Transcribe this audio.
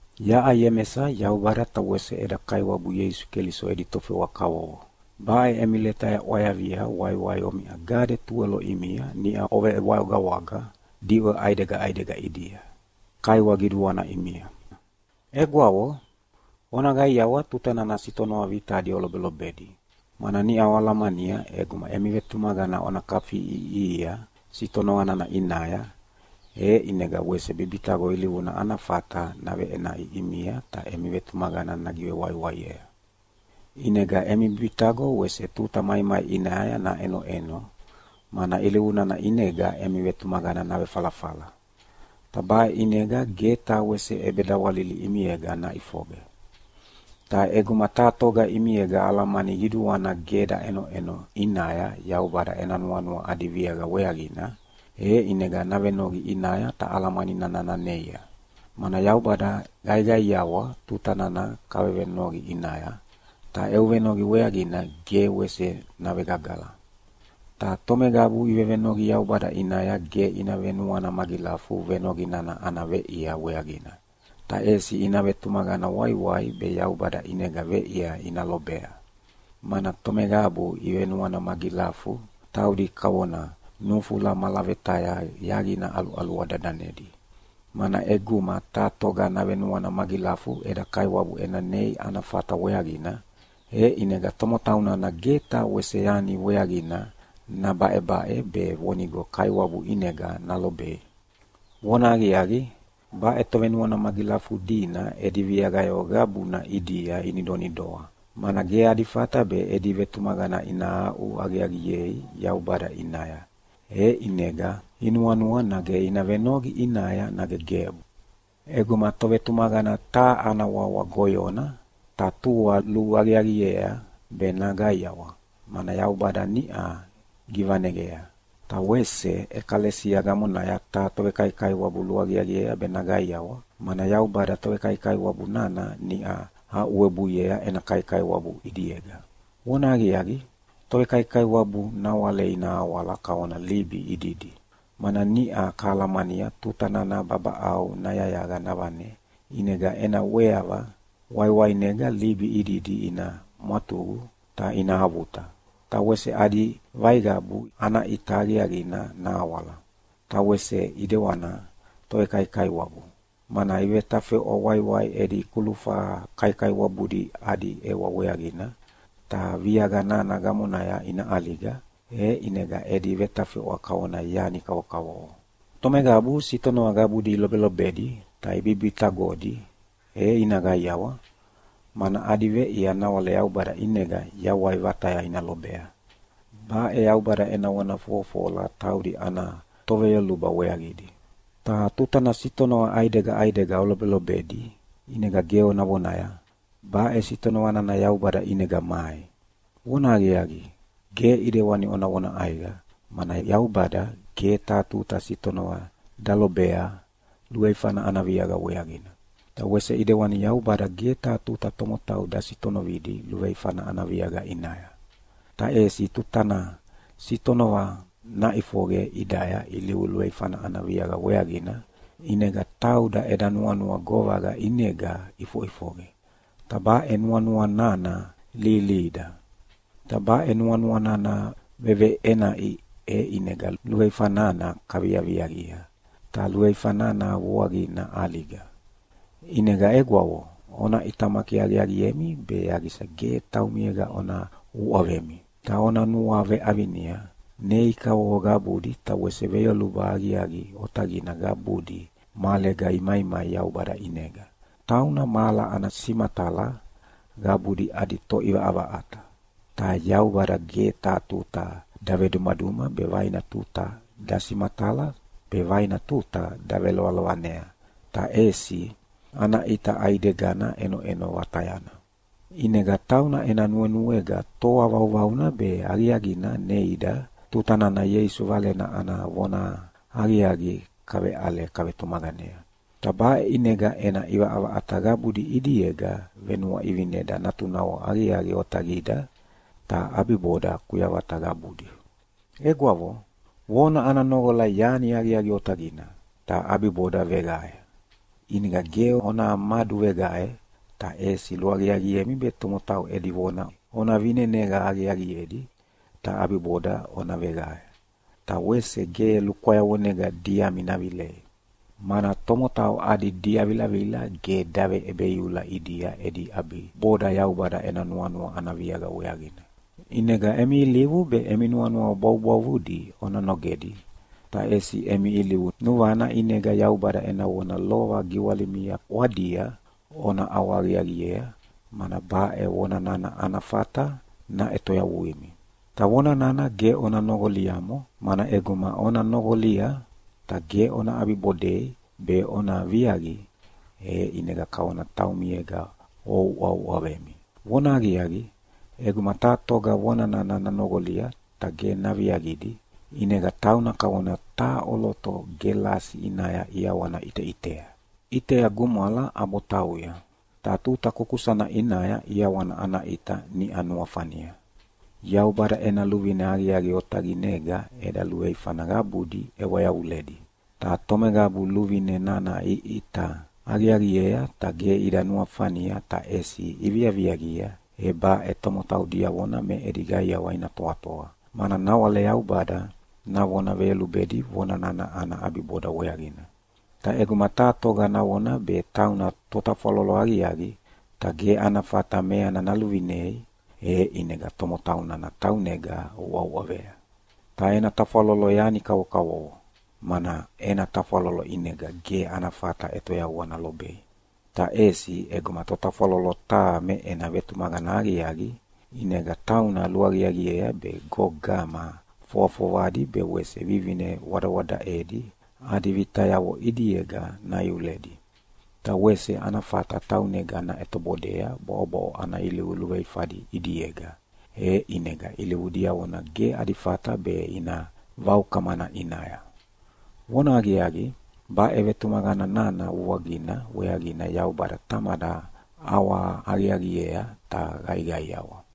Yaʼa Iemesa Yaubada ta wese eda Kaiwabu Ieisu Keliso edi tofewa kavovo. Baʼe emi leta yaʼwayavia waiwai omiʼa gade tuwelo ʼimia niʼa ovewagawaga diʼwe ʼaidega ʼaidega ʼidia. Kaiwa qiduana ʼimia. Egwavo, ona qaiawa tuta nana sitonova vitadi olobelobedi, mana niʼa oalamania ʼeguma emi vetumaqana ona kafiʼiʼihia sitonova nana ʼinaya, e ʼinega wese bibitaqo ilivuna ana fata naveʼenaʼi ʼimia ta emi vetumaqana nagivewaiwaiea. ʼInega emi bibitaqo wese tuta maimai ʼinaya naʼenoʼeno, mana ilivu nana ʼinega emi vetumaqana navefalafala. Ta baʼe ʼinega ge taha wese ʼebedawalili ʼimiega naʼifoqe. Ta ʼeguma taha toga ʼimiega alamani qiduana ge daʼenoʼeno ʼinaya Yaubada ena nuanua adi viaqa weaqina, e ʼinega navenoqi ʼinaya ta alamani nana naneia, mana Yaubada qaiqaiawa tuta nana kavevenoqi ʼinaya, ta eu venoqi weaqidi ge wese navegagala. Ta tomeqabu ivevenoqi Yaubada ʼinaya ge ina venuana magilafu venoqi nana ana veʼia weaqina, ta ʼesi ina vetumaqana waiwai be Yaubada ʼinega veʼia ina lobea, mana tomeqabu ivenuana magilafu taudi kavona nufula malavetaya yaqina ʼaluʼalua dadanedi. Mana ʼeguma taha toga navenuana magilafu eda Kaiwabu ena nei ana fata weaqina, e ʼinega tomotau nana ge taha wese yani weaqina nabaʼebaʼe be vonigo Kaiwabu ʼinega nalobei. Vonahaqiaqi, baʼe tovenuana magilafudina edi viaqayavo qabuna ʼidia inidonidoa, mana ge adi fata be edi vetumaqana ina aʼu aqiaqiei Yaubada ʼinaya, e ʼinega inuanua nage ina venoqi ʼinaya nage gebu. ʼEguma tovetumaqana taha ana wawa goyona, ta tua luaqiaqiea be naqaiawa, mana Yaubada niʼa givaneqea. Ta wese ʼekalesia gamonaya taha tovekaikaiwabu luaqiaqiea be naqaiawa, mana Yaubada tovekaikaiwabu nana niʼa aʼuwebuiea ena kaikaiwabu ʼidiega. Vonahaqiaqi, tovekaikaiwabu nawale ina awala kavona libi ididi, mana niʼa kahalamania tuta nana babaʼau nayayaqa navane ʼinega ena ʼweava waiwainega libi ididi ina mwatuqu ta ina avuta, ta wese adi vaiqavu ana ʼita aqiaqina nahawala. Ta wese ʼidewana tovekaikaiwabu, mana ivetafeʼwa waiwai edi kulufa kaikaiwabudi adi ʼewa weaqina, ta viaqa nana gamonaya ina ʼaliga, e ʼinega edi vetafeʼwa kavona yani kavokavovo. Tomeqabu sitonova qabudi ilobelobedi ta ibibitaqodi e ina qaiawa, mana adi veʼia nawale Yaubada ʼinega yawai vataya ina lobea. Baʼe Yaubada ena vona fofofola taudi ana toveyoluba weaqidi. Ta tutana sitonova ʼaidega ʼaidega olobelobedi ʼinega ge ona vonaya, “Baʼe sitonova nana Yaubada ʼinega mai.” Vonahaqiaqi, ge ʼidewani ona vona ʼaiqa, mana Yaubada ge taha tuta sitonova dalobea luveifana ana viaqa weaqina. Ta wese ʼidewani Yaubada ge taha tuta tomotau dasitonovidi luveifana ana viaqa ʼinaya. Ta ʼesi tuta nana sitonova naʼifoqe ʼidaya ilivu luveifana ana viaqa weaqina, ʼinega tauda eda nuanua govaqa ʼinega ʼifoʼifoqe, ta baʼe nuanua nana lihilihida. Ta baʼe nuanua nana veveʼenaʼi e ʼinega luveifa nana kaviaviaqia, ta luveifa nana vuaqina ʼaliga. ʼInega egwavo, ona ʼitamaki aqiaqiemi be yaqisa ge taumiega ona uʼavemi. Ta ona nuaveʼavinia, nei kavovo qabudi ta wese veyoluba aqiaqi otaqidi qabudi mahalega imaimai Yaubada ʼinega, tauna mahala ana simatala qabudi adi Toʼivaʼavaʼata. Ta Yaubada ge taha tuta davedumaduma be vaina tuta dasimatala be vaina tuta davelovanea, ta ʼesi ana ʼita ʼaidegana ʼenoʼeno vatayana. ʼInega tauna ena nuenuega toa vauvauna be aqiaqina neida tuta nana Ieisu Valena ana vonahaqiaqi kaveʼale kavetumaqanea. Ta baʼe ʼinega ena ʼivaʼavaʼata qabudi ʼidiega venuaʼivineda natunavo aqiaqi otaqida, ta ʼabiboda kuyavata qabudi. Egwavo, vona ana noqola yani aqiaqi otaqina, ta ʼabiboda veqae. ʼInega ge ona maduveqae, ta ʼesi luaqiaqiemi be tomotau edi vona ona vineneqa aqiaqiedi, ta ʼabiboda ona veqae. Ta wese ge lukwayavonega diami navilei, mana tomotau adi diavilavila ge daveʼebeiula ʼidia edi ʼabiboda Yaubada ena nuanua ana viaqa weaqina. ʼInega emi ilivu be emi nuanua bwavubwavudi ona nogedi, ta ʼesi emi ilivu nuvana ʼinega Yaubada ena vona lova giwalimia ʼwadia ona ʼawahaqiaqiea, mana baʼe vona nana ana fata naʼetoyavuimi. Ta vona nana ge ona noqoliamo, mana ʼeguma ona noqolia ta ge ona ʼabibodei be ona viaqi, e ʼinega kavona taumiega ouʼauʼavemi. Vonahaqiaqi, ʼeguma taha toga vona nana nanoqolia ta ge naviaqidi, ʼinega tauna kavona taha ʼoloto gelasi ʼinaya ʼiawana ʼiteʼitea. ʼItea gumwala ʼabo tauya, ta tuta kukusana ʼinaya ʼiawana ana ʼita niʼa nuafania. Yaubada ena luvine aqiaqi otaqinega eda luveifana qabudi ʼewa yavuledi, ta tomeqabu luvine nana iʼita aqiaqiea ta ge ida nuafania ta ʼesi iviaviaqia, e baʼe tomotau diavona me edi qaiawa ina toatoa, mana nawale Yaubada navona veyolubedi vona nana ana ʼabiboda weaqina. Ta ʼeguma taha toga navona be tauna totafwalolo aqiaqi, ta ge ana fata meana naluvinei, e ʼinega tomotau nana taunega uʼauʼavea, ta ena tafwalolo yani kavokavovo, mana ena tafwalolo ʼinega ge ana fata ʼetoyavua nalobei. Ta ʼesi ʼeguma totafwalolo taha me ena vetumaqana aqiaqi, ʼinega tauna luaqiaqiea be gogama fovafovadi be wese vivine wadawadaʼedi adi vitayavo ʼidiega naiuledi. Ta wese ana fata taunega naʼetobodea bwaʼobwaʼo ana ilivu luveifadi ʼidiega, e ʼinega ilivu diavona ge adi fata be ina vaukamana ʼinaya. Vonahaqiaqi, baʼe vetumaqana nana vuaqina weaqina Yaubada Tamada ʼawahaqiaqiea ta qaiqaiawa.